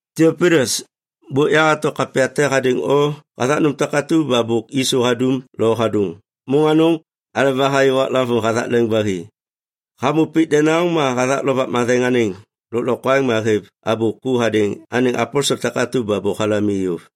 Tiapilus, bôk yahato kapya te hadêŋ o hathak nôm takatu ba bôk Yisu hadum lo hadôŋ, môŋ anôŋ aleba hayô waklavôŋ hathak leŋ ba hi. Hamô pik denaŋ ma hathak Lovak Matheŋ anêŋ lôklokwaŋ ma hêv abô ku hadêŋ anêŋ aposel takatu ba bôk halam i yôv.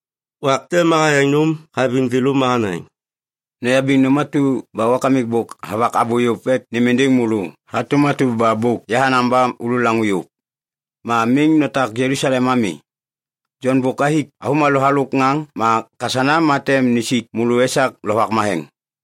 Wak te ma hayaŋ nôm haviŋ thêlô ma hanaŋ, “Noyabiŋ nôm atu ba Wakamik bôk havak abô yôv ek nêm êndêŋ môlô hatôm atu ba bôk yahanaŋ ba olaŋô yôv. Ma miŋ notak Jelusalem ami. Jon bôk hathik avômalô halôk ŋaŋ ma kasana ma tem nisik môlô esak Lovak Matheŋ.”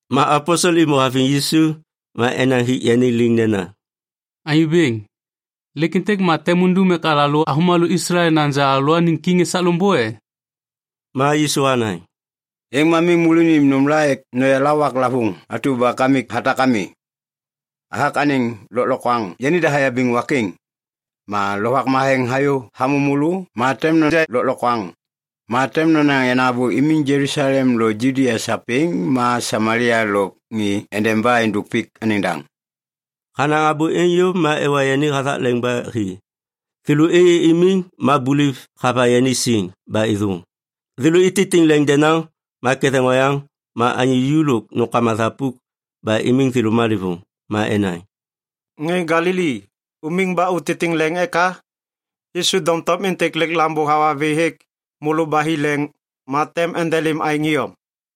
Ma aposel êmô haviŋ Yisu ma enaŋ hik yani liŋ nena, “Anyô Bêŋ, lêk êntêk ma tem undum ek alalô avômalô Islael naja alalôaniŋ kiŋ esak loŋbô e?” Ma Yisu hanaŋ, “Êŋ ma miŋ môlô unim nômla ek noyala waklavôŋ atu ba Kamik hatak ami. Hathak anêŋ lôklokwaŋ yanida hayabiŋ wak êŋ. Ma Lovak Matheŋ hayô hamô môlô, ma tem noja lôklokwaŋ. Ma tem nonaŋ yenaŋ abô imiŋ Jelusalem lôk Judia sapêŋ ma Samalia lôk ni endeba êndôk pik anêŋ daŋ.” Hanaŋ abô êŋ yôv, ma ewa yani hathak leŋ ba hi. Thêlô êyê imiŋ ma buliv hava yani siŋ ba êthôŋ. Thêlô ititiŋ leŋ denaŋ ma ketheŋ oyaŋ ma anyô ju lôk nômkama thapuk ba imiŋ thêlô malêvôŋ. Ma enaŋ, “Ŋê Galili, umiŋ ba utitiŋ leŋ eka? Yisu doŋtom êntêk lêk Lambô hawa vê hêk môlô ba hi leŋ ma tem endelêm aêŋ iyom.”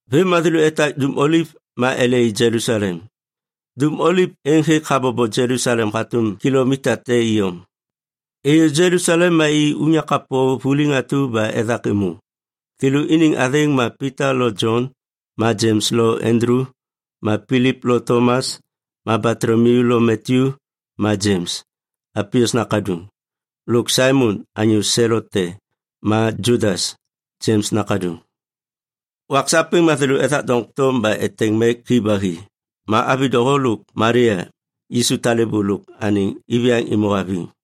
Vêm ma thêlô etak Dum Oliv ma ele i Jelusalem. Dum Oliv êŋ hêk habobo Jelusalem hatôm kilomita te iyom. Êyô Jelusalem ma i unyak kapô vuliŋ atu ba ethak êmô. Thêlô iniŋ athêŋ ma Pita lo Jon ma Jems lo Andulu ma Pilip lo Tomas ma Batolomiu lo Matyu ma Jems, Alpius nakaduŋ, lôk Saimon anyô Selot te, ma Judas, Jems nakaduŋ. Wak sapêŋ ma thêlô ethak doŋtom ba eteŋ mek hi ba hi. Ma avi doho lôk Malia, Yisu talêbô, lôk anêŋ iviyaŋ êmô haviŋ.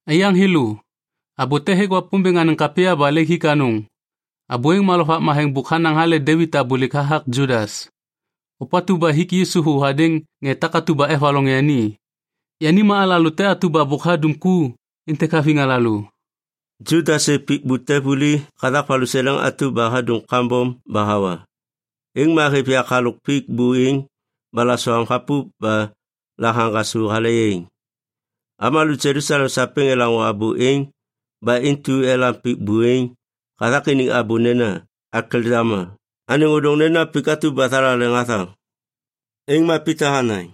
“Aiyaŋ thêlô, abô te hêk Wapômbêŋ anêŋ kapya ba lêk hik anôŋ. Abô êŋ ma Lovak Matheŋ bôk hanaŋ hale Devit abôlêk hathak Judas, ôpatu ba hik Yisu thô hadêŋ ŋê takatu ba evaloŋ yani. Yani ma alalô te atu ba bôk hadum ku êntêk haviŋ alalô.” (Judas hêv pik bute vuli hathak valuseleŋ atu ba hadum kambom ba hawa. Êŋ ma hêv yak halôk pik buêŋ ba lasoam hapup ba la haŋgasô hale yaiŋ. Avômalô Jelusalem sapêŋ elaŋô abô êŋ ba intu elam pik buêŋ hathak iniŋ abô nena “Akeldama”. Anêŋ ôdôŋ nena, “Pik atu ba thalaleŋ hathaŋ.”) Êŋ ma Pita hanaŋ,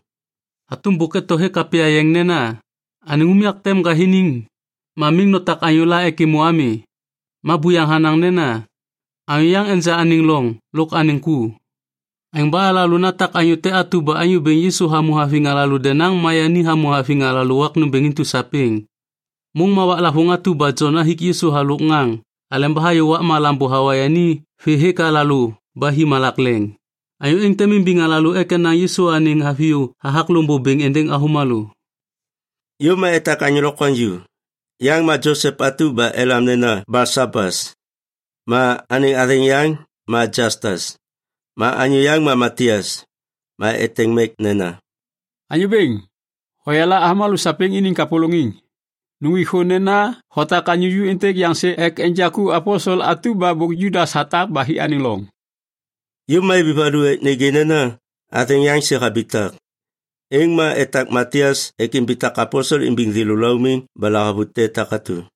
“Hatôm bôk eto hêk Kapya Yeŋ nena, “‘Anêŋ unyak tem ŋgathiniŋ; ma miŋ notak anyôla ek êmô ami.’ Ma buyaŋ hanaŋ nena, “‘Anyô yaŋ enja anêŋ loŋ lôk anêŋ ku.’ Aêŋ ba alalô natak anyô te atu ba Anyô Bêŋ Yisu hamô haviŋ alalô denaŋ ma yani hamô haviŋ alalô wak nômbêŋ intu sapêŋ, môŋ ma waklavôŋ atu ba Jon hathik Yisu halôk ŋaŋ aleba hayô wakma Lambô hawa yani vê hêk alalô ba hi malak leŋ. Anyô êŋ tem imbiŋ alalô ek enaŋ Yisu anêŋ haviyô hathak loŋbô bêŋ êndêŋ avômalô.” Yôv ma etak anyô lokwaŋju. Yaŋ ma Josep, elam nena Balsabas, ma athêŋ yaŋ ma Jastas. Ma anyô yaŋ ma Matias. Ma eteŋ mek nena, “Anyô Bêŋ, hoyala avômalô sapêŋ iniŋ kapôlôŋiŋ. Nuŋgwik thô nena hotak anyô ju êntêk yaŋ sê ek enja ku aposel atu ba bôk Judas hatak ba hi anêŋ loŋ.” Yôv ma ibi valu ek nêgê nena athêŋ yaŋ sê habitak. Êŋ ma etak Matias ek imbitak aposel imbiŋ thêlô laumiŋ ba lahavute takatu.